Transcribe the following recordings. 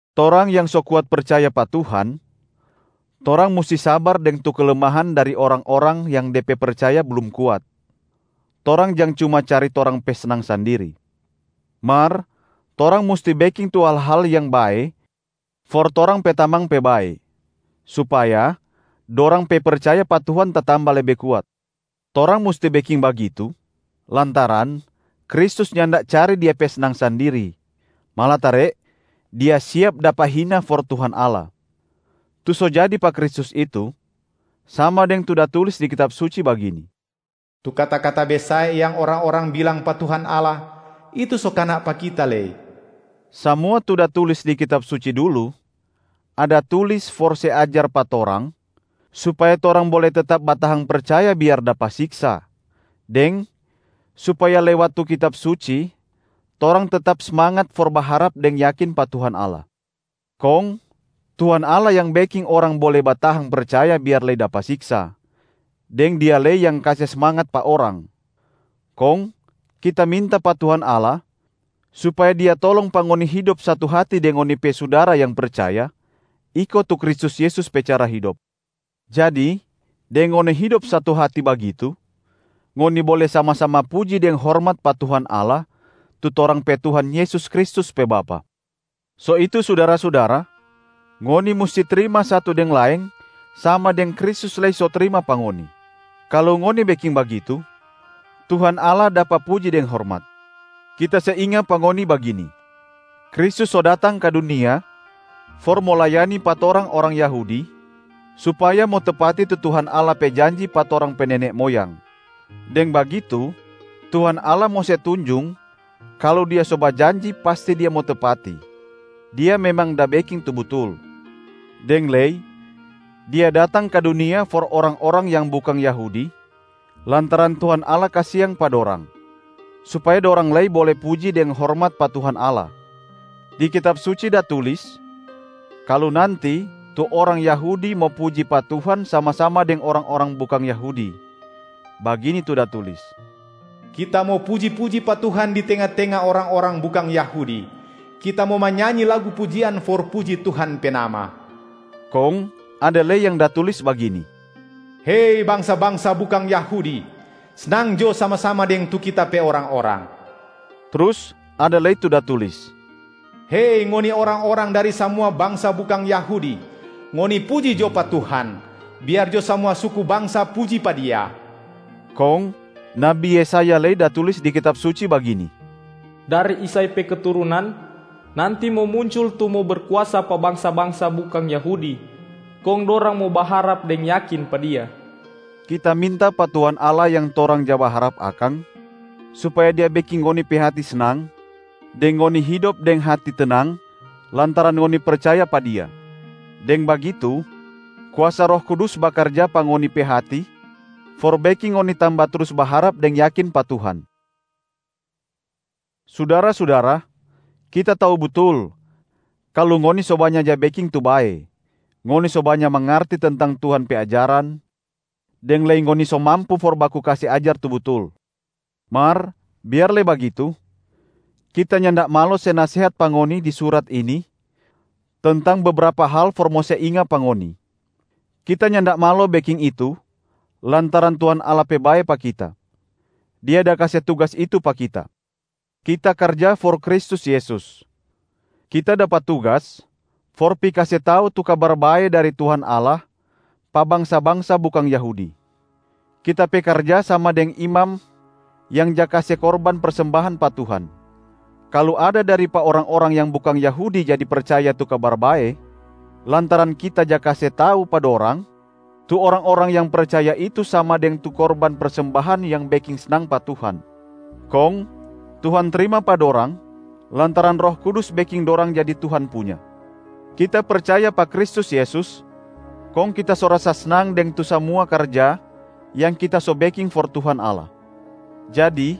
Torang yang so kuat percaya pa Tuhan, torang musti sabar deng tu kelemahan dari orang-orang yang de pe percaya blum kuat. Torang jang cuma cari torang pe snang sandiri. Mar torang musti beking tu hal-hal yang bae for torang pe tamang pe bae, supaya dorang pe percaya pa Tuhan tatamba lebe kuat. Torang musti beking bagitu lantaran Kristus nyanda cari Dia pe snang sandiri, malatare Dia siap dapa hina for Tuhan Allah. Tu so jadi pa Kristus itu, sama deng tu da tulis di Kitab Suci bagini, “Tu kata-kata besae yang orang-orang bilang pa Tuhan Allah, itu so kana pa Kita lei.” Samua tu da tulis di Kitab Suci dulu ada tulis for se ajar pa torang supaya torang bole tetap batahang percaya biar dapa siksa, deng supaya lewat tu Kitab Suci torang tetap smangat for baharap deng yakin pa Tuhan Allah. Kong Tuhan Allah yang beking orang bole batahang percaya biar lei dapa siksa, deng Dia lei yang kase smangat pa orang. Kong kita minta pa Tuhan Allah supaya Dia tolong pa ngoni hidop satu hati deng ngoni pe sudara yang percaya iko tu Kristus Yesus pe cara hidop. Jadi deng ngoni hidop satu hati bagitu, ngoni bole sama-sama puji deng hormat pa Tuhan Allah tu torang pe Tuhan Yesus Kristus pe Bapa. So itu sudara-sudara, ngoni musti trima satu deng laeng sama deng Kristus lei so trima pa ngoni. Kalu ngoni beking bagitu, Tuhan Allah dapa puji deng hormat. Kita se inga pa ngoni bagini: Kristus so datang ka dunia for mo layani pa torang orang Yahudi supaya mo tepati tu Tuhan Allah pe janji pa torang pe nene moyang. Deng bagitu Tuhan Allah mo se tunjung kalu Dia so bajanji pasti Dia mo tepati, Dia memang da beking tu butul. Deng lei Dia datang ka dunia for orang-orang yang bukang Yahudi lantaran Tuhan Allah kasiang pa dorang, supaya dorang lei bole puji deng hormat pa Tuhan Allah. Di Kitab Suci da tulis kalu nanti tu orang Yahudi mo puji pa Tuhan sama-sama deng orang-orang bukang Yahudi, bagini tu da tulis: “Kita mo puji-puji pa Tuhan di tenga-tenga orang-orang bukang Yahudi. Kita mo manyanyi lagu pujian for puji Tuhan pe nama.” Kong ada lei yang da tulis bagini, “Hei bangsa-bangsa bukang Yahudi! Snang jo sama-sama deng tu Kita pe orang-orang.” Trus ada lei tu da tulis, “Hei ngoni orang-orang dari samua bangsa bukang Yahudi, ngoni puji jo pa Tuhan! Biar jo samua suku bangsa puji pa Dia.” Kong nabi Yesaya lei da tulis di Kitab Suci bagini, “Dari Isai pe keturunan nanti mo muncul tu mo berkuasa pa bangsa-bangsa bukang Yahudi, kong dorang mo baharap deng yakin pa Dia.” Kita minta pa Tuhan Allah yang torang ja baharap akang, supaya Dia beking ngoni pe hati snang deng ngoni hidop deng hati tenang lantaran ngoni percaya pa Dia. Deng bagitu kuasa Roh Kudus bakarja pa ngoni pe hati for beking ngoni tamba trus baharap deng yakin pa Tuhan. Sudara-sudara, kita tau butul kalu ngoni so banya ja beking tu bae, ngoni so banya mangarti tentang tu Tuhan pe ajaran, deng lei ngoni so mampu for baku kase ajar tu butul. Mar biar lei bagitu, kita nyanda malo se nasehat pa ngoni di surat ini tentang bebrapa hal for mo se inga pa ngoni. Kita nyanda malo beking itu lantaran Tuhan Allah pe bae pa kita; Dia da kase tugas itu pa kita. Kita karja for Kristus Yesus, kita dapa tugas for pi kase tau tu Kabar Bae dari Tuhan Allah pa bangsa-bangsa bukang Yahudi. Kita pe karja sama deng imam yang ja kase korban persembahan pa Tuhan. Kalu ada dari pa orang-orang yang bukang Yahudi jadi percaya tu Kabar Bae lantaran kita ja kase tau pa dorang, tu orang-orang yang percaya itu sama deng tu korban persembahan yang beking snang pa Tuhan. Kong Tuhan trima pa dorang lantaran Roh Kudus beking dorang jadi Tuhan punya. Kita percaya pa Kristus Yesus, kong kita so rasa snang deng tu samua karja yang kita so beking for Tuhan Allah. Jadi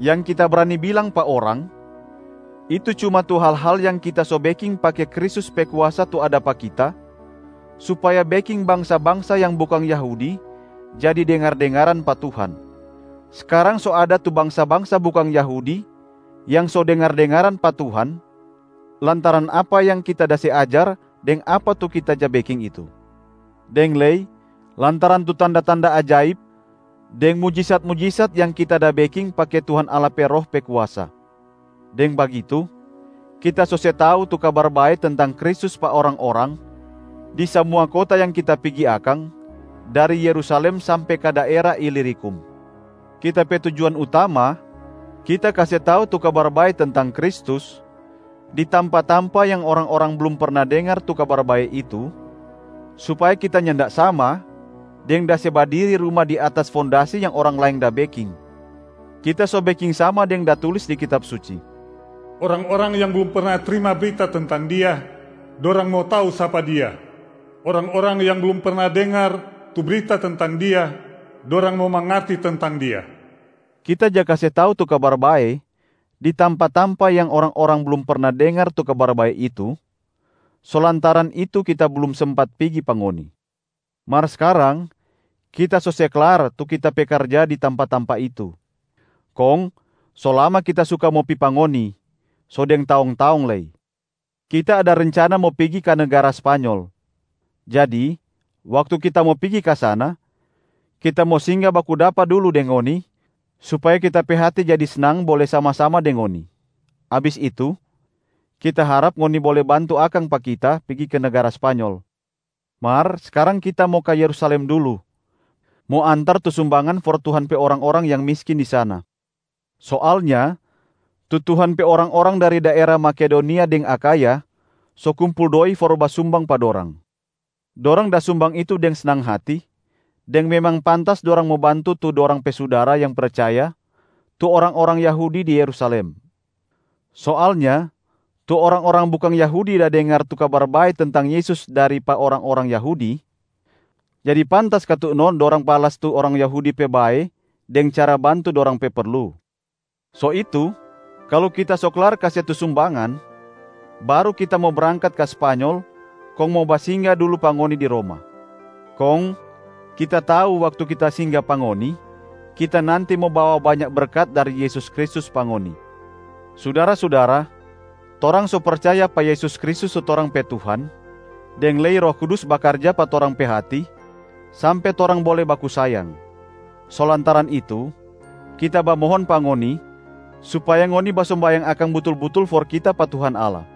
yang kita brani bilang pa orang, itu cuma tu hal-hal yang kita so beking pake Kristus pe kuasa tu ada pa kita supaya beking bangsa-bangsa yang bukang Yahudi jadi dengar-dengaran pa Tuhan. Skarang so ada tu bangsa-bangsa bukang Yahudi yang so dengar-dengaran pa Tuhan lantaran apa yang kita da se ajar deng apa tu kita ja beking itu. Deng lei lantaran tu tanda-tanda ajaib deng mujisat-mujisat yang kita da beking pake Tuhan Allah pe Roh pe kuasa. Deng bagitu, kita so se tau tu Kabar Bae tentang Kristus pa orang-orang di samua kota yang kita pigi akang, dari Yerusalem sampe ka daera Ilirikum. Kita pe tujuan utama kita kase tau tu Kabar Bae tentang Kristus di tampa-tampa yang orang-orang blum perna dengar tu Kabar Bae itu, supaya kita nyanda sama deng da se badiri ruma di atas fondasi yang orang laeng da beking. Kita so beking sama deng da tulis di Kitab Suci, “Orang-orang yang blum perna trima brita tentang Dia, dorang mo tau sapa Dia. Orang-orang yang blum perna dengar tu brita tentang Dia, dorang mo mangarti tentang Dia.” Kita ja kase tau tu Kabar Bae di tampa-tampa yang orang-orang blum perna dengar tu Kabar Bae itu, so lantaran itu kita blum sempat pigi pa ngoni. Mar skarang kita so se klar tu kita pe karja di tampa-tampa itu. Kong so lama kita suka mo pi pa ngoni, so deng taong-taong lei. Kita ada rencana mo pigi ka negara Spanyol. Jadi waktu kita mo pigi ka sana, kita mo singga baku dapa dulu deng ngoni supaya kita pe hati jadi snang bole sama-sama deng ngoni. Abis itu, kita harap ngoni bole bantu akang pa kita pigi ka negara Spanyol. Mar skarang kita mo ka Yerusalem dulu, mo antar tu sumbangan for Tuhan pe orang-orang yang miskin di sana. Soalnya tu Tuhan pe orang-orang dari daera Makedonia deng Akhaya so kumpul doi for basumbang pa dorang. Dorang da sumbang itu deng snang hati deng memang pantas dorang mo bantu tu dorang pe sudara yang percaya tu orang-orang Yahudi di Yerusalem. Soalnya, tu orang-orang bukang Yahudi da dengar tu Kabar Bae tentang Yesus dari pa orang-orang Yahudi, jadi pantas katu no dorang balas tu orang Yahudi pe bae deng cara bantu dorang pe perlu. So itu kalu kita so klar kase tu sumbangan, baru kita mo brangkat ka Spanyol kong mo basingga dulu pa ngoni di Roma. Kong kita tau waktu kita singga pa ngoni, kita nanti mo bawa banya berkat dari Yesus Kristus pa ngoni. Sudara-sudara, torang so percaya pa Yesus Kristus tu torang pe Tuhan, deng lei Roh Kudus bakarja pa torang pe hati sampe torang bole baku sayang. So lantaran itu, kita bamohon pa ngoni supaya ngoni basombayang akang butul-butul for kita pa Tuhan Allah.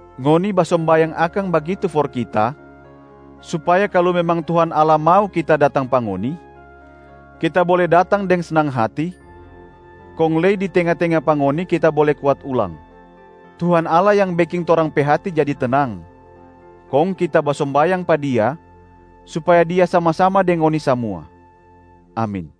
Ngoni basombayang akang bagitu for kita supaya kalu memang Tuhan Allah mau kita datang pa ngoni, kita bole datang deng snang hati kong lei di tenga-tenga pa ngoni kita bole kuat ulang. Tuhan Allah yang beking torang pe hati jadi tenang, kong kita basombayang pa Dia supaya Dia sama-sama deng ngoni samua. Amin.